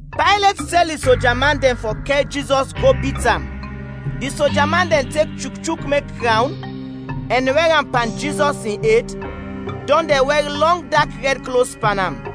Paylet tɛl di soja man dɛn fɔ kɛr Jizɔs go bit am. Di soja man dɛn tek chukchuk mek krawn ɛn wɛr am pan Jizɔs in ed, dɔn dɛn wɛr lɔng dak rɛd klos pan am.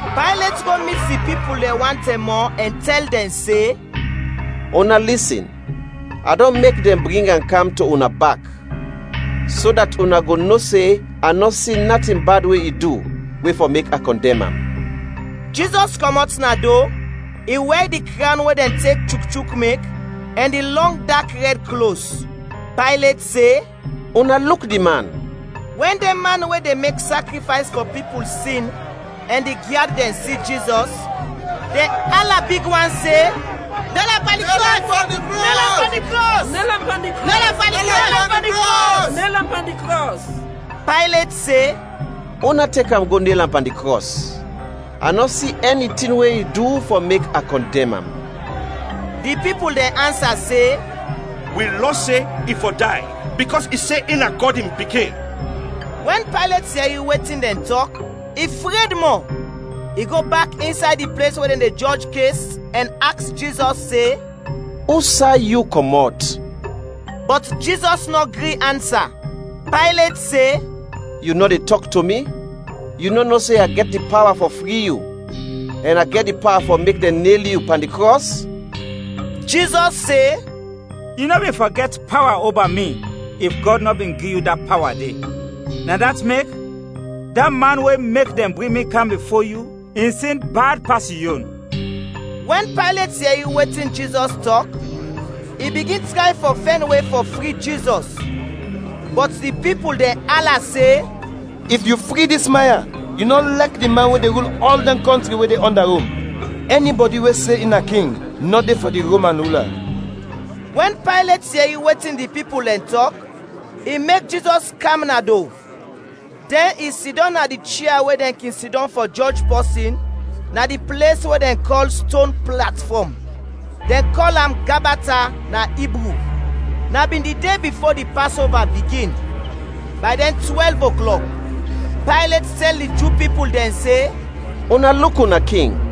Paylet go mit di pipul dɛn wan tɛm mɔ ɛn tɛl dɛn se, “Una lisin, a dɔn mek dɛn bring am kam to una bak, so dat una go no se a nɔ si natin bad we i du, we fɔ mek a kɔndɛm am.” Jizɔs kɔmɔt na do, i wɛr di krawn we dɛn tek chukchuk mek, ɛn di lɔng dak rɛd klos. Paylet se, “Una luk di man.” Wɛn dɛn man we de mek sakrifays fɔ pipul sin ɛn di gyad dɛn si Jizɔs, dɛn ala big wan se, “Nel am pan di krɔs! Nel am pan di krɔs!” Paylet se, “Una tek am, go nel am pan di krɔs. A nɔ si ɛni tin we i du fɔ mek a kɔndɛm am.” Di pipul dɛn ansa se, “Wi lɔ se i fɔ day, bikɔs i se in na Gɔd in Pikin.” Wɛn Paylet yɛri wetin dɛn tɔk, i fred mɔ. I go bak insay di ples we dɛn de jɔj kes ɛn aks Jizɔs se, “Usay yu kɔmɔt?” Bɔt Jizɔs nɔ gri ansa. Paylet se, “Yu nɔ de tɔk to mi? Yu nɔ no se a gɛt di pawa fɔ fri yu ɛn a gɛt di pawa fɔ mek dɛn nel yu pan di krɔs?” Jizɔs se, “Yu nɔ bin fɔ gɛt pawa oba mi if Gɔd nɔ bin gi yu da pawa de. Na dat mek, da man we mek dɛn bring mi kam bifo yu in sin bad pas yu yon.” Wɛn Paylet yɛri wetin Jizɔs tɔk, i bigin tray fɔ fɛn we fɔ fri Jizɔs. Bɔt di pipul dɛn ala se, “If yu fri dis man ya, yu nɔ lɛk di man we de rul ɔl dɛn kɔntri we de ɔnda Rom. Ɛnibɔdi we se in na King, nɔ de fɔ di Roman rula.” Wɛn Paylet yɛri wetin di pipul dɛn tɔk, i mek Jizɔs kam na do, dɛn i sidɔm na di chia we dɛn kin sidɔm fɔ jɔj pɔsin, na di ples we dɛn kɔl “Ston Platfɔm”. (Dɛn kɔl am “Gabata” na Ibru.) Na bin di de bifo di Pasova bigin, bay dɛn twɛlv oklɔk. Paylet tɛl di Ju pipul dɛn se, “Una luk una King!”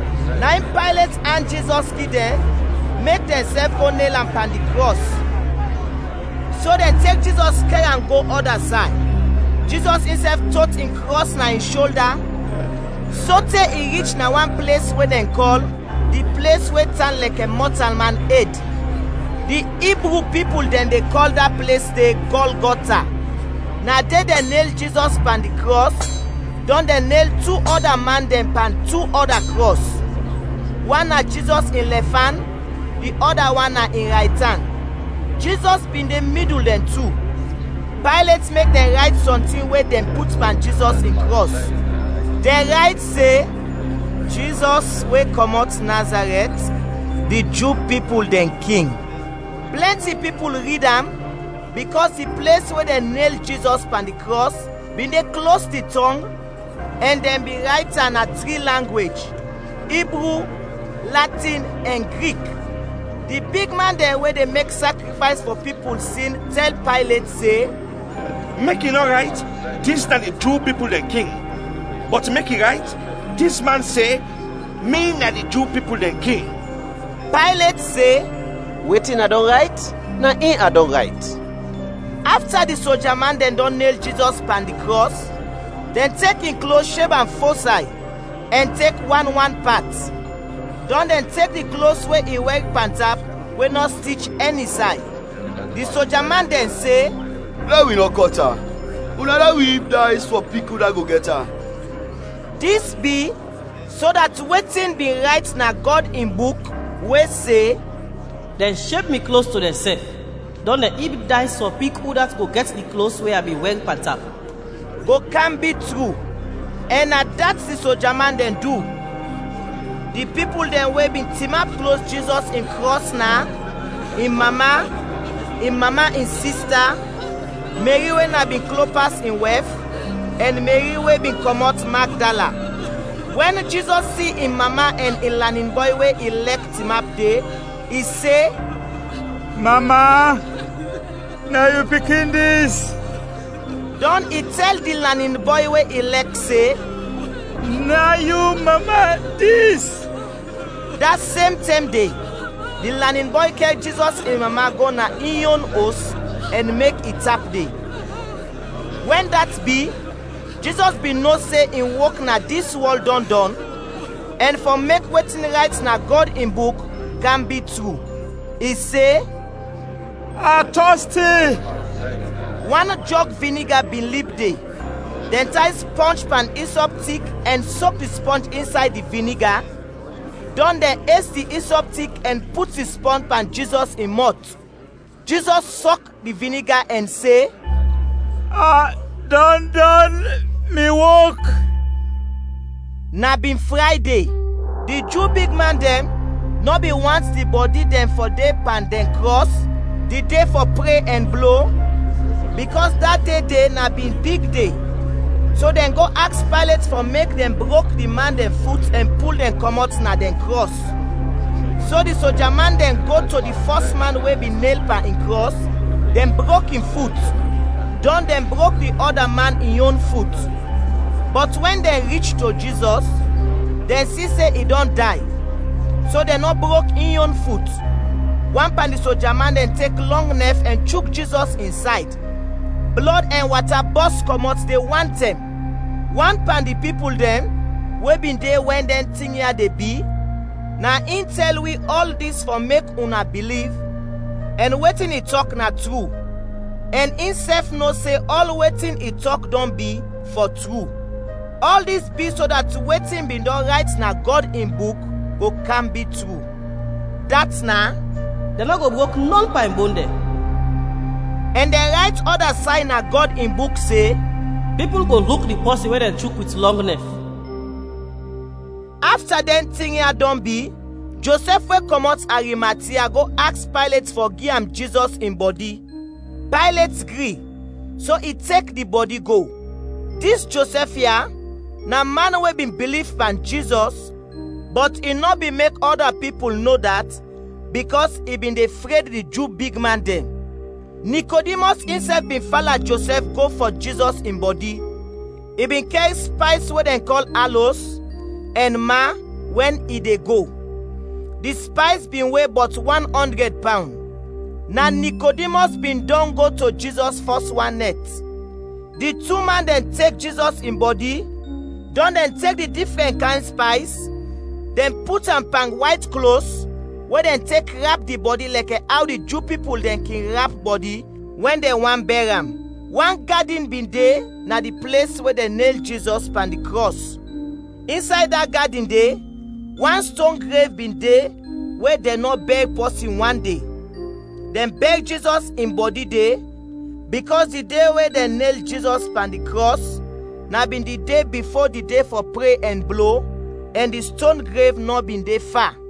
Na in Paylet and Jizɔs gi dɛn, mek dɛnsɛf go nel am pan di krɔs. So dɛn tek Jizɔs kɛr am go ɔda say. Jizɔs insɛf tot in krɔs na in sholda, sote i rich na wan ples we dɛn kɔl “Di ples we tan lɛkɛ mɔtalman ed”. (Di Ibru pipul dɛn de kɔl da ples de “Gɔlgɔta”.) Na de dɛn nel Jizɔs pan di krɔs, dɔn dɛn nel tu ɔda man dɛn pan tu ɔda krɔs; wan na Jizɔs in lɛfan, di ɔda wan na in raytan, Jizɔs bin de midul dɛn tu. Paylet mek dɛn rayt sɔntin we dɛn put pan Jizɔs in krɔs. Dɛn rayt se, “Jizɔs we kɔmɔt Nazarɛt, di Ju pipul dɛn King.” Plɛnti pipul rid am, bikɔs di ples we dɛn nel Jizɔs pan di krɔs bin de klos di tɔng, ɛn dɛn bin rayt am na tri langwej: Ibru, Latin ɛn Grik. Di bigman dɛn we de mek sakrifays fɔ pipul sin tɛl Paylet se, “Mek i nɔ rayt, ‘Dis na di Ju pipul dɛn King’, bɔt mek i rayt, ‘Dis man se, mi na di Ju pipul dɛn King.’” Paylet se, “Wetin a dɔn rayt, na in a dɔn rayt.” Afta di sojaman dɛn dɔn nel Jizɔs pan di krɔs, dɛn tek in klos sheb am fo say ɛn tek wan wan pat. Dɔn dɛn tek di klos we i wɛr pantap we nɔ stich ɛni say. Di soja man dɛn se, “Lɛ wi nɔ kɔt am, una lɛ wi ib days fɔ pik udat go gɛt am.” Dis bi, so dat wetin bin rayt na Gɔd in Buk, we se, “Dɛn sheb mi klos to dɛnsɛf, dɔn dɛn ib days fɔ pik udat go gɛt di klos we a bin wɛr pantap,” go kam bi tru. Ɛn na dat di soja man dɛn du. Di pipul dɛn we bin tinap klos Jizɔs in krɔs na: in mama, in mama in sista, Meri we na bin Klopas in wɛf, ɛn Meri we bin kɔmɔt Magdala. Wɛn Jizɔs si in mama ɛn in lanin bɔy we i lɛk tinap de, i se, “Mama, na yu pikin dis.” Dɔn i tɛl di lanin bɔy we i lɛk se, “Na yu mama dis.” Da sem tɛm de, di lanin bɔy kɛr Jizɔs in mama go na in yon os ɛn mek i tap de. Wɛn dat bi, Jizɔs bin no se in wok na dis wɔl dɔn dɔn, ɛn fɔ mek wetin rayt na Gɔd in Buk kam bi tru, i se, “A tɔsti.” Wan jɔg viniga bin lib de; dɛn tay spɔnj pan isɔp tik ɛn sok di spɔnj insay di viniga, dɔn dɛn es di isɔp tik ɛn put di spɔnj pan Jizɔs in mɔt. Jizɔs sɔk di viniga ɛn se, “A dɔn dɔn mi wok!” Na bin Frayde; di Ju bigman dɛn nɔ bin want di bɔdi dɛn fɔ de pan dɛn krɔs di de fɔ pre ɛn blo, bikɔs da de de na bin big de, so dɛn go aks Paylet fɔ mek dɛn brok di man dɛn fut ɛn pul dɛn kɔmɔt na dɛn krɔs. So di soja man dɛn go to di fɔs man we bin nel pan in krɔs, dɛn brok in fut; dɔn dɛn brok di ɔda man in yon fut. Bɔt wɛn dɛn rich to Jizɔs, dɛn si se i dɔn day, so dɛn nɔ brok in yon fut. Wan pan di soja man dɛn tek lɔng nɛf ɛn chuk Jizɔs in sayd, blɔd ɛn wata bɔs kɔmɔt de wantɛm. (Wan pan di pipul dɛn we bin de wɛn dɛn tin ya de bi, na in tɛl wi ɔl dis fɔ mek una biliv, ɛn wetin i tɔk na tru ɛn insɛf no se ɔl wetin i tɔk dɔn bi, fɔ tru.) Ɔl dis bi so dat wetin bin dɔn rayt na Gɔd in Buk go kam bi tru. Dat na: “Dɛn nɔ go brok nɔn pan in bon dɛn.” Ɛn dɛn rayt ɔda say na Gɔd in Buk se, “Pipul go luk di pɔsin we dɛn chuk wit lɔng nɛf.” Afta dɛn tin ya dɔn bi, Josɛf we kɔmɔt Arimatia go aks Paylet fɔ gi am Jizɔs in bɔdi. Paylet gri, so i tek di bɔdi go. (Dis Josɛf ya na man we bin biliv pan Jizɔs, bɔt i nɔ bin mek ɔda pipul no dat bikɔs i bin de fred di Ju bigman dɛn.) Nikodimɔs insɛf bin fala Josɛf go fɔ Jizɔs in bɔdi. I bin kɛr spays we dɛn kɔl alos ɛn ma wɛn i de go. Di spays bin we bɔt wan ɔndrɛd pawn. (Na Nikodimɔs bin dɔn go to Jizɔs fɔs wan nɛt.) Di tu man dɛn tek Jizɔs in bɔdi, dɔn dɛn tek di difrɛn kayn spays dɛn put am pan wayt klos we dɛn tek rap di bɔdi lɛkɛ aw di Ju pipul dɛn kin rap bɔdi wɛn dɛn want bɛr am. Wan gadin bin de na di ples we dɛn nel Jizɔs pan di krɔs. Insay da gadin de wan ston grev bin de we dɛn nɔ bɛr pɔsin wande. Dɛn bɛr Jizɔs in bɔdi de, bikɔs di de we dɛn nel Jizɔs pan di krɔs na bin di de bifo di de fɔ pre ɛn blo, ɛn di ston grev nɔ bin de fa.